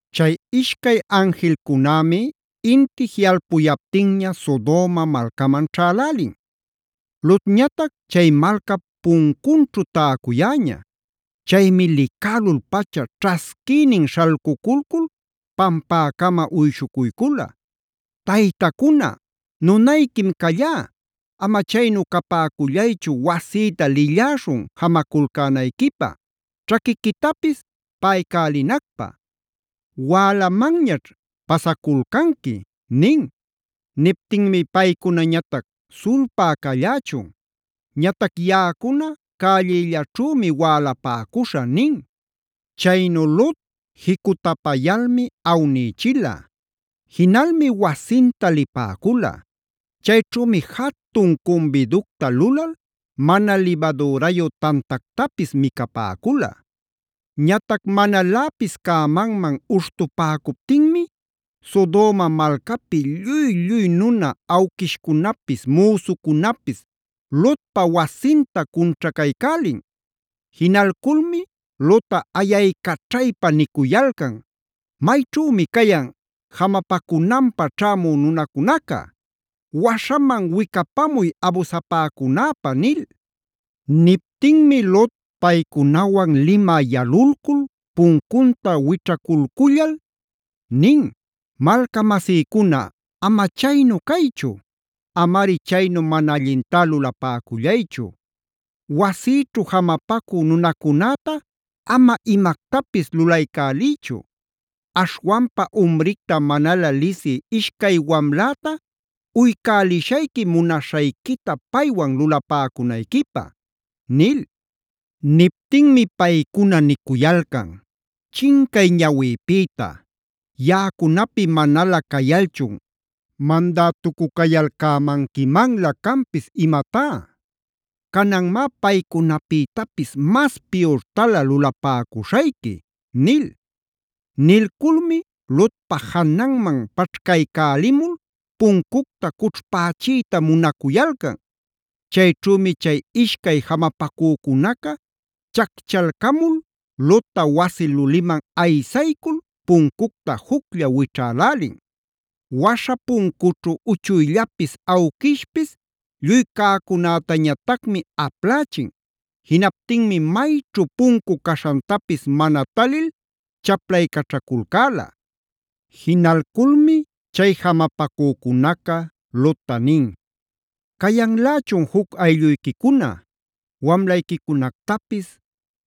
Chay ishcay anjilcunämi inti jiꞌalpuyaptinña Sodoma malcaman ćhälälin. Lotñatac chay malcap puncunćhu täcuyäña. Chaymi licälul-pacha ćhasquïnin śhalcuculcul pampäcama uyshucuycula: “Taytacuna, nunayquim callá; ama chaynu capäcullaychu wasïta lilläśhun jamaculcänayquipä, ćhaquiquitapis paꞌaycälinacpä. Wälamanñaćh pasaculcanqui” nin. Niptinmi paycunañatac: “Sulpá callächun, ñatac yaꞌacuna cällillaćhümi wälapäcuśhä” nin. Chaynu Lot jicutapayalmi awnïchila; jinalmi wasinta lipäcula. Chayćhümi jatun cumbiducta lulal mana libadürayu tantactapis micapäcula. Ñatac manaläpis cämanman uśhtupäcuptinmi Sodoma malcapi lluy-lluy nuna awquishcunapis, müsucunapis Lotpa wasinta cunćhacaycälin. Jinalculmi Lotta ayaycaćhaypa nicuyalcan: “¿Mayćhümi cayan jamapacunanpä ćhämu nunacunaca? ¡Waśhaman wicapamuy abusapäcunäpä!” nil. Niptinmi Lot paycunawan limä yalulcul puncunta wićhaculcullal nin: “Malcamasïcuna ama chaynu caychu; amari chaynu mana allintá lulapäcullaychu. Wasïćhu jamapacü nunacunäta ama imactapis lulaycäliychu. Aśhwanpa umricta manalä lisï ishcay wamläta uycälishayqui munaśhayquita paywan lulapäcunayquipä” nil. Niptinmi paycuna nicuyalcan: “¡Chincay ñawïpïta! ¡Yaꞌacunapi manalä cayalchun mandätucu-cayalcämanquimanlä canpis imatá! ¡Cananmá paycunapïtapis mas piyurtalä lulapäcuśhayqui!” nil. Nilculmi Lotpa jananman paćhcaycälimul puncucta cućhpächiyta munacuyalcan. Chayćhümi chay ishcay jamapacücunaca chacchalcamul Lotta wasi luliman aysaycul, puncucta juclla wićhälälin. Waśha puncućhu uchuyllapis awquishpis lluy cäcunätañatacmi aplächin. Jinaptinmi mayćhu puncu caśhantapis mana talil chaplaycaćhaculcäla. Jinalculmi chay jamapacücunaca Lotta nin: “¿Cayanlächun juc aylluyquicuna? Wamlayquicunactapis,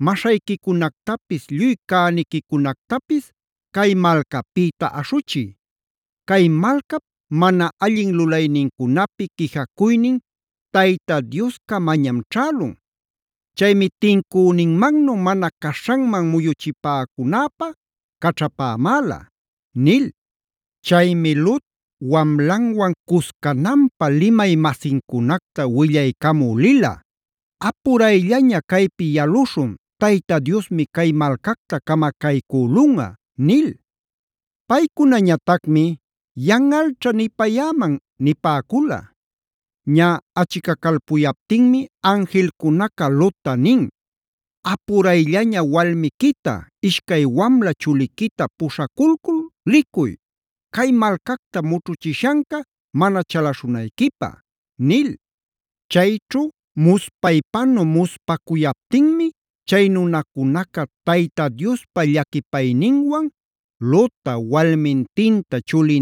maśhayquicunactapis lluy cäniquicunactapis cay malcapïta aśhuchiy. Cay malcap mana allin lulaynincunapi quijacuynin Tayta Dioscamañam ćhälun. Chaymi tincüninmannu mana caśhanman muyuchipäcunäpä caćhapämäla” nil. Chaymi Lot wamlanwan cuscananpä limay-masincunacta willaycamü lila: “Apurayllaña caypi yaluśhun, Tayta Diosmi cay malcacta camacaycülunꞌa” nil. Paycunañatacmi: “Yanꞌalćha nipayäman” nipäcula. Ñä achicacalpuyaptinmi anjilcunaca Lotta nin: “Apurayllaña walmiquita, ishcay wamla chuliquita puśhaculcul licuy; cay malcacta mućhuchishanca mana chalaśhunayquipä” nil. Chayćhu muspaypanu muspacuyaptinmi chay nunacunaca Tayta Diospa llaquipayninwan Lotta, walmintinta,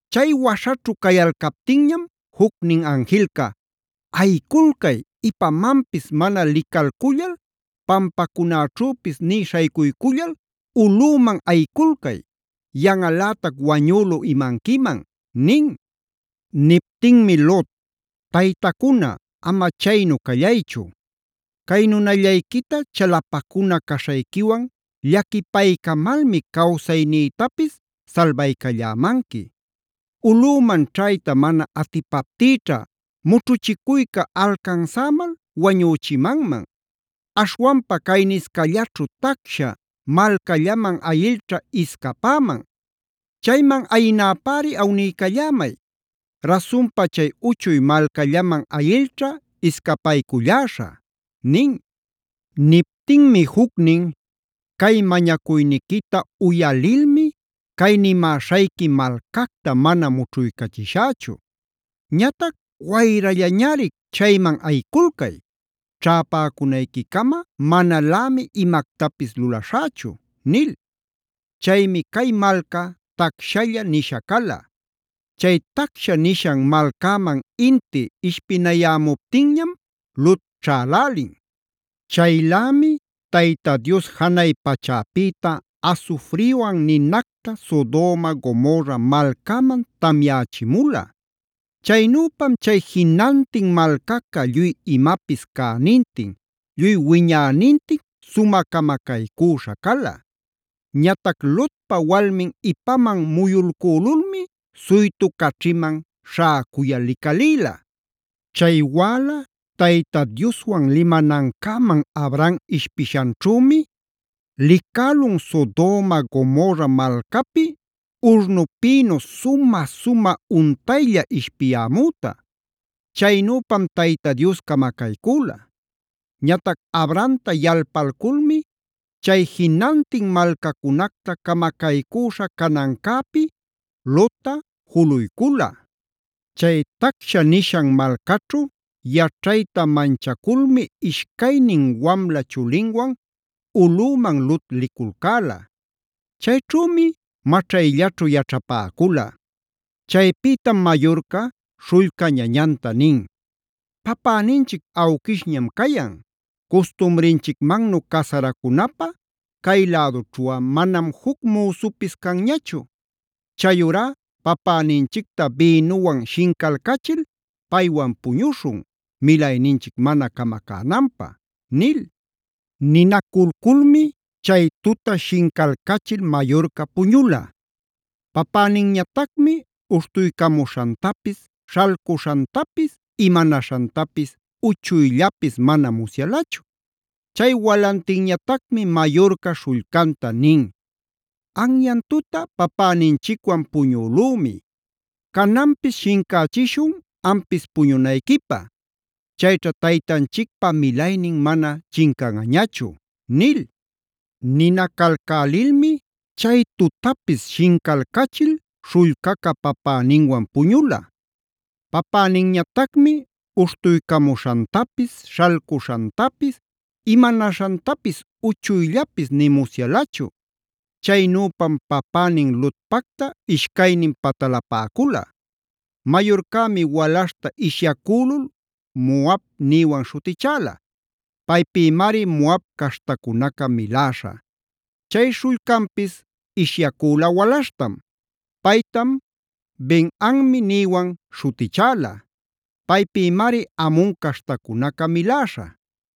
Chay waśhaćhu cayalcaptinñam jucnin anjilca: “¡Ayiculcay! Ipamanpis mana licalcullal pampacunäćhüpis nï śhaycuycullal ulꞌüman ayiculcay; yanꞌalätac wañülu imanquiman” nin. Niptinmi Lot: “Taytacuna, ama chaynu callaychu, cay nunallayquita chalapacuna caśhayquiwan llaquipaycamalmi cawsaynïtapis salbaycallämanqui. Ulꞌüman ćhayta mana atipaptïćha mućhuchicuyca alcansämal wañüchimanman. Aśhwanpa cayniscallaćhu tacsha malcallaman ayilćha iscapäman. Chayman ayinäpäri awniycallämay. Rasunpa chay uchuy malcallaman ayilćha iscapayculläśhä” nin. Niptinmi jucnin: “Cay mañacuyniquita uyalilmi, cay nimäśhayqui malcacta mana mućhuycachishächu. Ñatac wayrallañari chayman ayiculcay. Ćhäpäcunayquicama manalämi imactapis lulaśhächu” nil. Chaymi cay malca “tacshalla”b nisha cala. Chay tacsha nishan malcäman inti ishpinayämuptinñam Lot ćhälälin. Chaylämi Tayta Dios janay pachäpïta asufriwan ninacta Sodoma Gomorra malcäman tamyächimula. Chaynüpam chay jinantin malcaca lluy imapis cänintin lluy wiñänintin sumä camacaycüśha cala.c Ñatac Lotpa walmind ipaman muyulcülulmi suytu caćhiman śhäcuyal licalïla. Chay wäla Tayta Dioswan limanancäman Abraham ishpishanćhümi, licälun Sodoma Gomorra malcapi urnupïnu sumä-sumä untaylla ishpiyämüta. Chaynüpam Tayta Dios camacaycüla. Ñatac Abrahamta yalpalculmi chay jinantin malcacunacta camacaycüśha canancäpi Lotta juluycula. Chay tacsha nishan malcaćhu yaćhayta manchaculmi ishcaynin wamla chulinwan ulꞌüman Lot liculcäla. Chayćhümi maćhayllaćhu yaćhapäcula. Chaypïtam mayurca śhullca ñañanta nin: “Papäninchic awquishñam cayan; custumrinchicmannu casaracunapä cay lädućhuꞌa manam juc müsupis canñachu. Chayurá papäninchicta bïnuwan shincalcachil paywan puñuśhun milayninchic mana camacänanpä” nil. Ninaculculmi chay tuta shincalcachil mayurca puñula. Papäninñatacmi uśhtuycamuśhantapis, śhalcuśhantapis imanaśhantapis uchuyllapis mana musyalachu. Chay walantinñatacmi mayurca śhullcanta nin: “Anyan tuta papäninchicwan puñülümi. Cananpis shincächishun ampis puñunayquipä. Chayćha taytanchicpa milaynin mana chincanꞌañachu” nil. Ninacalcälilmi chay tutapis shincalcachil śhullcaca papäninwan puñula. Papäninñatacmi uśhtuycamuśhantapis, śhalcuśhantapis, imanaśhantapis uchuyllapis nï musyalachu. Chaynüpam papänin Lotpacta ishcaynin patalapäcula. Mayurcämi walaśhta ishyacülul Moab nïwan śhutichäla. Paypïmari Moab caśhtacunaca miläśha. Chay śhullcanpis ishyacüla walaśhtam. Paytam Ben-ammi nïwan śhutichäla. Paypïmari Amon caśhtacunaca miläśha.